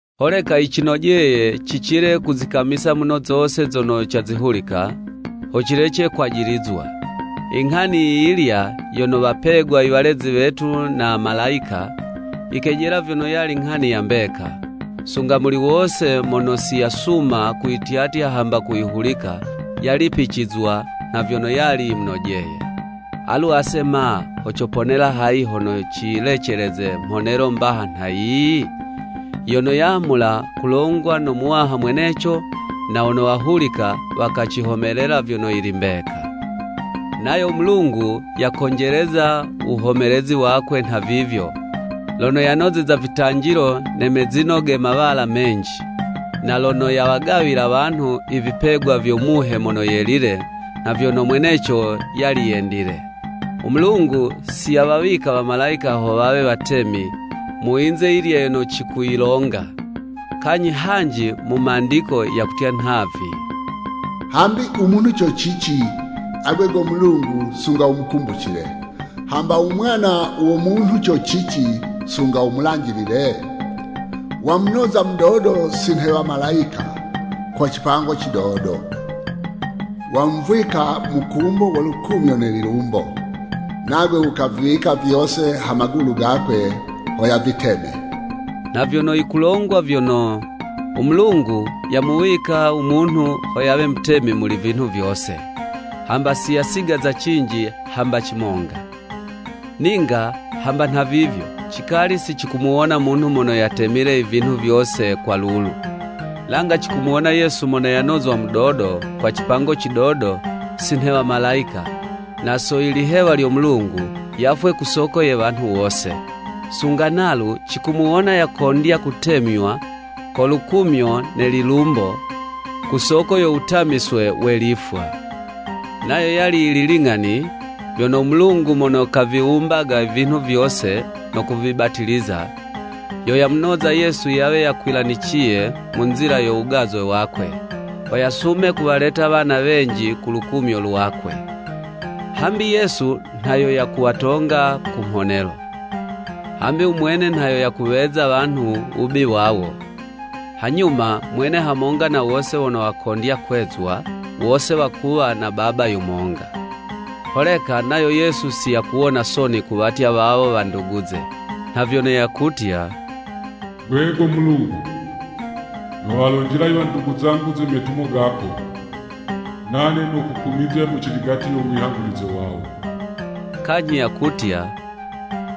Holeka yicinojeye cicile kuzikamisa muno zose zono cazihulika, ho cilece kwajilizwa. Inghani yi yilya yono wapegwa i walezi wetu na malayika, yikejela vyono yali nghani ya mbeka, sunga muli wose mono si yasuma kuyityatya hamba kuyihulika, yalipicizwa nha vyono yali yimunojeye. Alu ase ma! Ho coponela hayi hono ciyileceleze mhonelo mbaha nha yiyi? Yono yamula kulongwa no Muwaha mweneco, na wono wahulika, wakacihomelela vyono yili mbeka. Nayo u Mulungu yakonjeleza u wuhomelezi wakwe nhavivyo, lono yanozeza vitanjilo ne mezino ge mawala menji, na lono yawagawila wanhu i vipegwa vyo Muhe Mono Yelile nha vyono mweneco yali yendile. U Mulungu si yawawika Wamalayika ho wawe watemi mu yinze yilya yono cikuyilonga. Kanyhi hanji mu Mandiko hakutya nhavi: “Hambi u munhu co cici, agwe go Mulungu sunga wumukumbucile, hamba u mwana wo munhu co cici sunga wumulanjilile? Wamunoza mudodo si nhe wamalayika kwa cipango cidodo. Wamuvwika mukumbo wo lukumyo ne lilumbo. Nagwe wukaviwika vyose ha magulu gakwe ho yaviteme.” Nha vyono yikulongwa vyono, u Mulungu yamuwika u munhu ho yawe mutemi muli vinhu vyose, hamba si yasigaza cinji hamba cimonga. Ninga hamba nhavivyo, cikali si cikumuwona munhu mono yatemile i vinhu vyose kwa lulu. Langa cikumuwona Yesu mono yanozwa mudodo kwa cipango cidodo si nhe wamalayika, na so i lihewa lyo Mulungu, yafwe ku soko ye wanhu wose. Sunga nalu cikumuwona yakondya kutemywa ko lukumyo ne lilumbo, ku soko yo wutamiswe we lifwa. Nayo yali yili ling'ani, vyono u Mulungu mono kaviwumbaga i vinhu vyose no kuvibatiliza, yo yamunoza Yesu yawe yakwilaniciye mu nzila yo wugazwe wakwe, ho yasume kuwaleta wana wenji ku lukumyo lwakwe. Hambi Yesu nha yo yakuwatonga ku mhonelo. Hambi u mwene nha yo yakuweza wanhu u wubi wawo, hanyuma mwene hamonga na wose wono wakondya kwezwa, wose wakuwa na Baba yumonga. Holeka nayo Yesu si yakuwona soni kuwatya wawo wanduguze, nha vyono yakutya, “Gwe go Mulungu, nowalonjela i wandugu zangu ze metumo gako. Nane nokukumizya mu ciligati yo wihangulize wawo.” Kanyhi yakutya,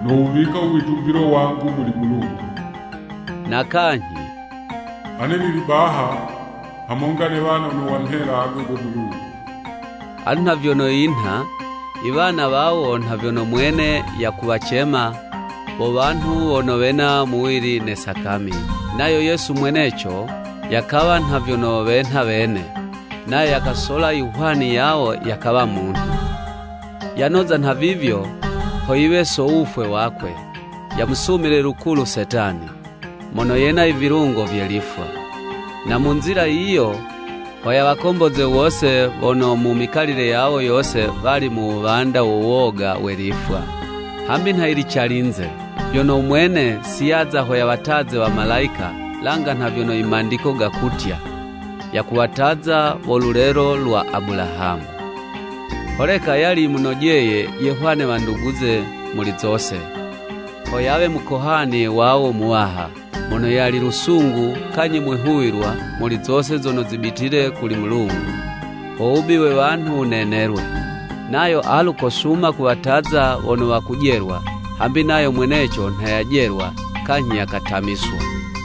“Nowuwika u witumbilo wangu muli Mulungu.” Na kanyhi, “Ane nili baha hamonga ne wana wono wamhela agwe go Mulungu.” Alu nha vyono yinha, i wana wawo nha vyono mwene yakuwacema, wo wanhu wono wena muwili ne sakami, nayo Yesu mweneco, yakawa nha vyono wenha wene, nayo yakasola i hwani yawo yakawa munhu. Yanoza nhavivyo, ho yiwe so wufwe wakwe, yamusumile lukulu Setani, mono yena i vilungo vye lifwa, na mu nzila yiyo ho yawakomboze wose wono mu mikalile yawo yose wali mu wuwanda wo woga we lifwa. Hambi nha yili calinze, vyono u mwene si yaza ho yawataze wamalayika, langa nha vyono i Mandiko gakutya, “Yakuwataza wo lulelo lwa Abulahamu.” Holeka yali yimunojeye yehwane wanduguze muli zose, ho yawe Mukohani wawo Muwaha, mono yali lusungu kanyhi mwihuwilwa muli zose zono zibitile kuli Mulungu, ho wubi we wanhu wunenelwe. Nayo alu kosuma kuwataza wono wakujelwa, hambi nayo mweneco nha yajelwa kanyhi yakatamiswa.